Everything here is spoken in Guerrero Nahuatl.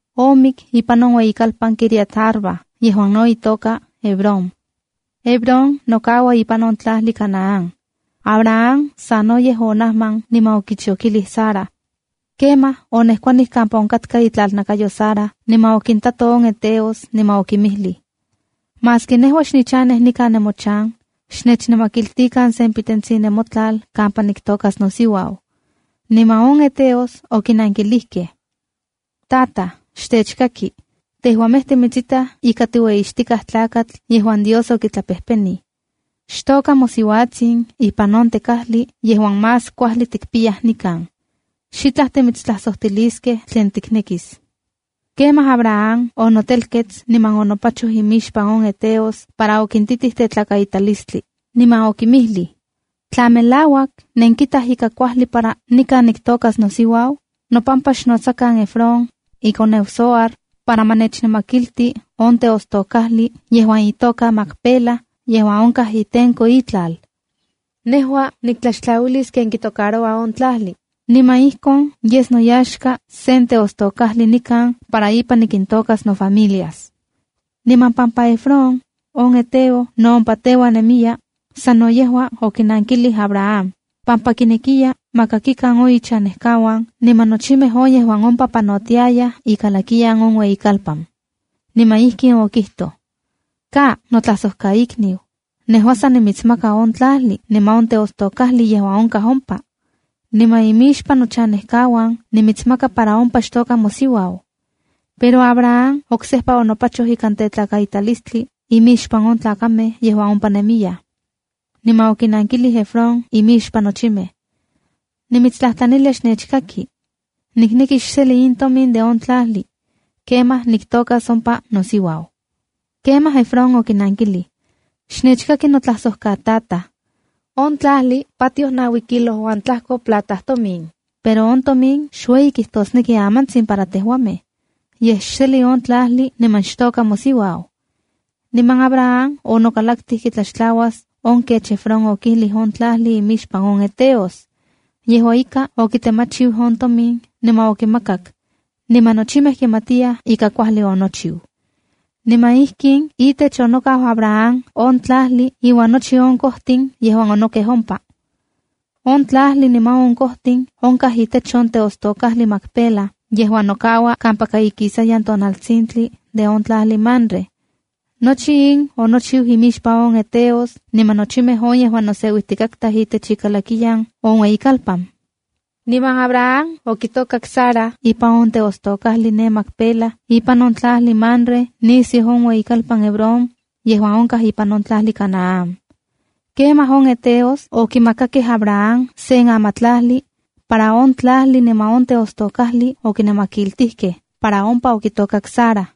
Omik ipan on ueyikalpan Quiriat-arba yejuan no itoka Hebrón. Hebrón nokaua ipan on tlajli Canaán. Abraham sanoyej onajman niman okichokilij Sara. Kemaj onejkuanij kampa onkatka itlalnakayo Sara niman okintato on heteos niman okinmijlij: —Maski nejua xnichanej nikan nemochan, xnechnamakiltikan se pitetsin nemotlal kampa niktokas nosiuau. Niman on heteos okinankilijkej: —¡Tajta, xtechkaki! Tejuamej timitsitaj ika tiueyixtikaj tlakatl yejuan Dios okitlapejpenij. Xtoka mosiuatsin ipan on tekajli yejuan más kuajli tikpiyaj nikan. Xitlaj timitstlajsojtiliskej tlen tiknekis. Kemaj Abraham onotelkets niman onopachoj imixpan on heteos para okintitij tetlakaitalistli, niman okinmijlij: —Tla melauak nenkitaj ika kuajli para nikan niktokas nosiuau, nopampa xnotsakan Efrón, ikoneu Zohar, para ma nechnamakilti on teostokajli yejuan itoka Macpela yejuan onkaj itenko itlal. Nejua niktlaxtlauilis ken kitocaroua on tlajli, niman ijkon yes noyaxka sen teostokajli nikan para ipan nikintokas nofamilias. Niman pampa Efrón, on heteo no ompa teuan nemiya, sano yejua okinankilij Abraham, pampa kinekiya ma kakikan on ichanejkauan niman nochimej on yejuan ompa panotiayaj ikalakiyan on ueyikalpan. Niman ijkin okijtoj: —¡Ka notlajsojkaikniu! Nejua san nimitsmaka on tlajli niman on teostokajli yejuan onkaj ompa. Nikan imixpan nochanejkauan nimitsmaka para ompa xtoka mosiuau. Pero Abraham oksejpa onopachoj ikan tetlakaitalistli imixpan on tlakamej yejuan ompa nemiyaj. Niman okinankijlij Efrón imixpan nochimej: —¡Nimitstlajtlanilia xnechkaki! Nikneki xseli in tomin de on tlajli. Kemaj niktokas ompa nosiuau. Kemaj Efrón okinankilij: —Xnechkaki notlajsojkatataj. On tlajli patioj naui kilo uan tlajko plata tomin, pero on tomin xueyi kijtosneki amantsin para tejuamej. Yej xeli on tlajli niman xtoka mosiuau. Niman Abraham onokalaktij kitlaxtlauas on kech Efrón okijlij on tlajli imixpan on heteos. Yejua ika, okitemachiu on tomin niman okimakak, niman nochimej kimatiyaj ika kuajli onochiu. Niman ijkin itech onokau Abraham on tlajli iuan nochi on kojtin yejuan onokej ompa. On tlajli niman kojtin onkaj itech on teostokajli Macpela yejuan nokaua kampaka ikisayan tonaltsintli de on tlajli Mamre. Nochi in onochiu imixpan on heteos niman nochimej on yejuan noseuijtikatkaj itech ikalakiya on ueyikalpan. Niman Abraham okitokak Sara ipan on teostokajli ne Macpela ipan on tlajli Mamre nisiu on ueyikalpan Hebrón yejuan onkaj ipan on tlajli Canaán. Kemaj on heteos okimakakej Abraham sen amatlajli, para on tlajli niman on teostokajli okinamakiltijkej para ompa okitokak Sara.